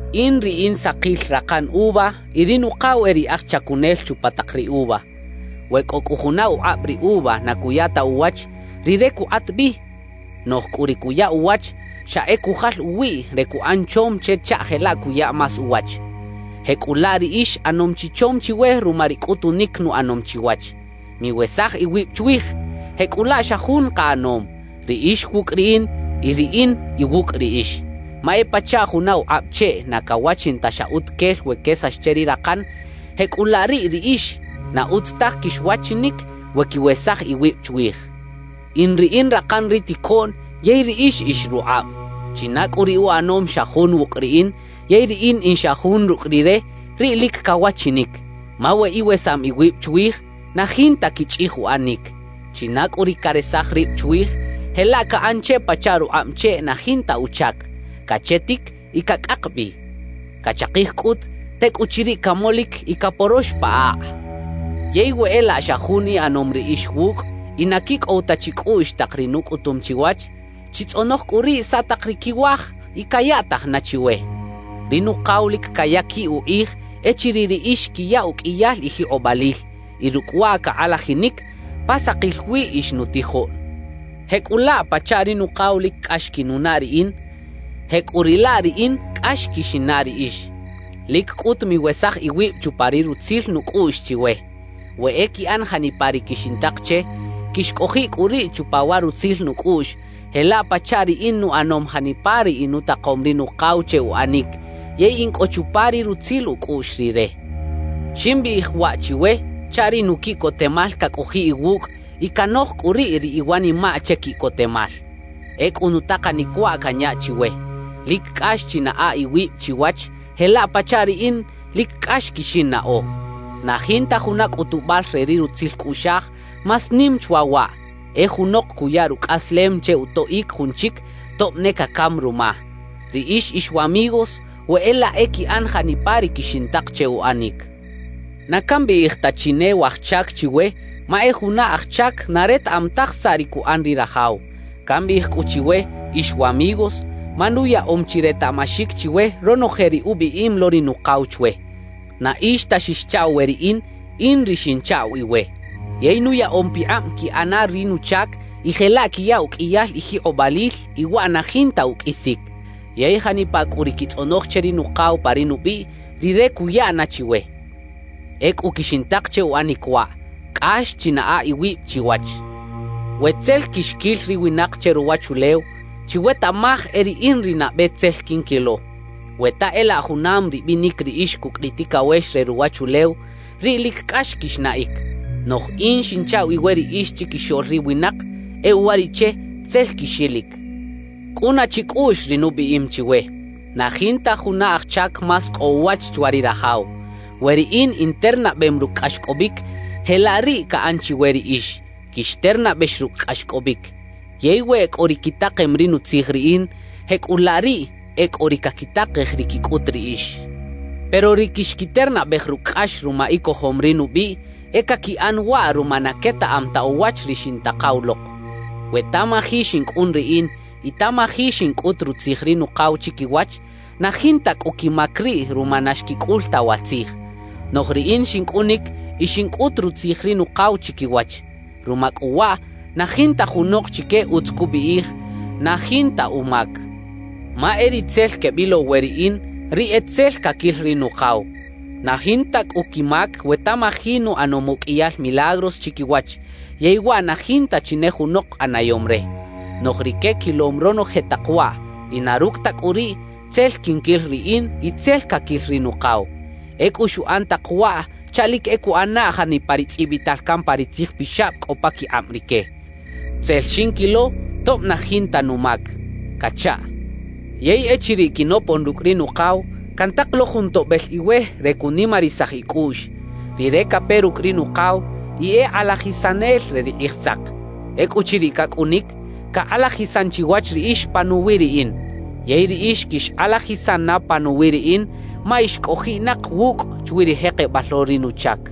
»In ri in sakil rakan uva y ri Nukaw e ri aj chacunel chupa tak ri uva. We cꞌo cꞌu juna ukꞌab ri uva na cuya ta uwach, Rire cukꞌat bi. Noꞌj cꞌu ri cuya uwach, xa e cujal uwiꞌ re cuꞌan chom che chaꞌ jelaꞌ cuya más uwach. Jecꞌulaꞌ riꞌix ꞌanom chi chom chiwe ruma ri cꞌutunic nuꞌanom chiwach. »Miwesaj iwib chwij, jecꞌulaꞌ xa jun kaꞌanom, riꞌix wucꞌ riꞌin y riꞌin iwucꞌ riꞌix. Ma e pachaꞌ juna ukꞌab cheꞌ na cawachin ta xa utuquel we quesax che ri rakan; jecꞌulaꞌ riꞌ riꞌix, na utz taj quixwachinic we quiwesaj iwib chwij. »In ri in rakan ri ticoꞌn yey riꞌix ix rukꞌab. China cꞌu ri uꞌanom xa jun wucꞌ riꞌin yey riꞌin in xa jun rucꞌ rire, riꞌ lic cawachinic. Ma we iwesam iwib chwij, na jinta quichꞌij uꞌanic. China cꞌu ri caresaj rib chwij, jelaꞌ caꞌan che pachaꞌ rukꞌab cheꞌ na jinta uchac, cachetic y cacꞌak bi. Cachakij cꞌut, tecꞌuchiriꞌ camolic y caporox pa akꞌ. »Yey we e laꞌ xa jun iꞌanom riꞌix wucꞌ y na quicꞌow ta chicꞌuꞌx tak ri nucꞌutum chiwach, chitzꞌonoj cꞌu riꞌ saꞌ tak ri quiwaj y cayaꞌtaj na chiwe. Ri Nukaw lic cayaquiꞌ ukꞌij echiriꞌ riꞌix quiya uqꞌuiyal ijikꞌobalil y rucꞌ waꞌ cakꞌalajinic pa sakil wi ix nutijoꞌn. »Jecꞌulaꞌ pachaꞌ ri Nukaw lic cꞌax quinunaꞌ riꞌin, jecꞌuriꞌlaꞌ riꞌin cꞌax quixinnaꞌ riꞌix. Lic cꞌut miwesaj iwib chupa ri rutzil nucꞌuꞌx chiwe. We e quiꞌan janipa ri quixintak che, quixcꞌojiꞌ cꞌu riꞌ chupa wa rutzil nucꞌuꞌx, jelaꞌ pachaꞌ riꞌin nuꞌanom janipa ri inutakom ri Nukaw che uꞌanic yey in cꞌo chupa ri rutzil ucꞌuꞌx Rire. »Ximbiꞌij waꞌ chiwe chaꞌ ri nuquiꞌcotemal cacꞌojiꞌ iwucꞌ y canoj cꞌu riꞌ ri iwanimaꞌ che quiꞌcotemal. »Ecꞌu nutakanic waꞌ canya chiwe: Lic cꞌax chinaꞌa iwib chiwach jelaꞌ pachaꞌ riꞌin lic cꞌax quixinnaꞌo. Na jinta juna cꞌutubal re ri rutzil cꞌuꞌxaj más nim chwa waꞌ: E junok cuya rucꞌaslem che utoꞌic jun chic tob ne cacam ruma. »Riꞌix ix wamigos we e laꞌ e quiꞌan janipa ri quixintak che uꞌanic. Na cambiꞌij ta chi ne “waj chac” chiwe, ma e juna aj chac na retaꞌam taj saꞌ ri cuꞌan ri rajaw. Cambiꞌij cꞌu chiwe “ix wamigos”, ma nuyaꞌom chi retaꞌmaxic chiwe ronoje ri ubiꞌim lo ri Nukaw chwe. Na ix ta xixchaꞌw we riꞌin, in ri xinchaꞌw iwe. Yey nuyaꞌom pikꞌab quiꞌana ri nuchac y jelaꞌ quiya uqꞌuiyal ijikꞌobalil y waꞌ na jinta uqꞌuisic. Yey janipa cꞌu ri quitzꞌonoj che ri Nukaw pa ri nubiꞌ, Rire cuya na chiwe. Ecꞌu quixintak che uꞌanic waꞌ: Cꞌax chinaꞌa iwib chiwach. »We tzel quixquil ri winak che ruwachulew, chiwetaꞌmaj e riꞌin ri nabe tzel quinquilo. We ta e laꞌ junam ribinic riꞌix cucꞌ ri ticawex re ruwachulew, riꞌ lic cꞌax quixnaꞌic. Noꞌj in xinchaꞌw iwe riꞌix chiquixoꞌl ri winak; e uwariꞌche tzel quixilic. Cꞌuna chicꞌuꞌx ri nubiꞌim chiwe: Na jinta juna aj chac más cꞌo uwach chwa ri rajaw. We riꞌin internabem rucꞌ cꞌaxcꞌobic, jelaꞌ riꞌ caꞌan chiwe riꞌix, quixternabex rucꞌ cꞌaxcꞌobic. Yey we e cꞌo ri quitakem ri nutzij riꞌin, jecꞌulaꞌ riꞌ, e cꞌo ri caquitakej ri quicꞌut riꞌix. Pero ri quixquiternabej rucꞌ cꞌax ruma icojom ri nubiꞌ, e caquiꞌan waꞌ ruma na quetaꞌam ta uwach ri xintakaw lok. »We tamaji xincꞌun riꞌin y tamaji xincꞌut rutzij ri Nukaw chiquiwach, na jinta cꞌu quimac riꞌ ruma na xquicꞌul ta wa tzij. Noꞌj riꞌin xincꞌunic y xincꞌut rutzij ri Nukaw chiquiwach; ruma cꞌu waꞌ, na jinta junok chique utz cubiꞌij na jinta umac. Ma e ri tzel quebilow we riꞌin, riꞌ e tzel caquil ri Nukaw. Na jinta cꞌu quimac we tamaji nuꞌanom uqꞌuiyal milagros chiquiwach yey waꞌ na jinta chi ne junok ꞌanayom re. Noꞌj rique quilom ronoje tak waꞌ; y na rucꞌ ta cꞌu riꞌ, tzel quinquil riꞌin y tzel caquil ri Nukaw. »Ecꞌu xuꞌan tak waꞌ chaꞌ lic e cuꞌana janipa ri tzꞌibital can pa ri Tzij Pixab cꞌo paquikꞌab rique: Tzel xinquilo tob na jinta numac cachaꞌ. »Yey echiriꞌ quinopon rucꞌ ri Nukaw, cantak lo Jun Toꞌbel iwe re cunimarisaj icꞌuꞌx. Rire cape rucꞌ ri Nukaw y e Kꞌalajisanel re ri Kꞌijsak. Ecꞌuchiriꞌ cacꞌunic, cakꞌalajisan chiwach riꞌix panuwi riꞌin. Yey riꞌix quixkꞌalajisan na panuwi riꞌin, ma ix cꞌojiꞌnak wucꞌ chwi ri jekebal lo ri nuchac.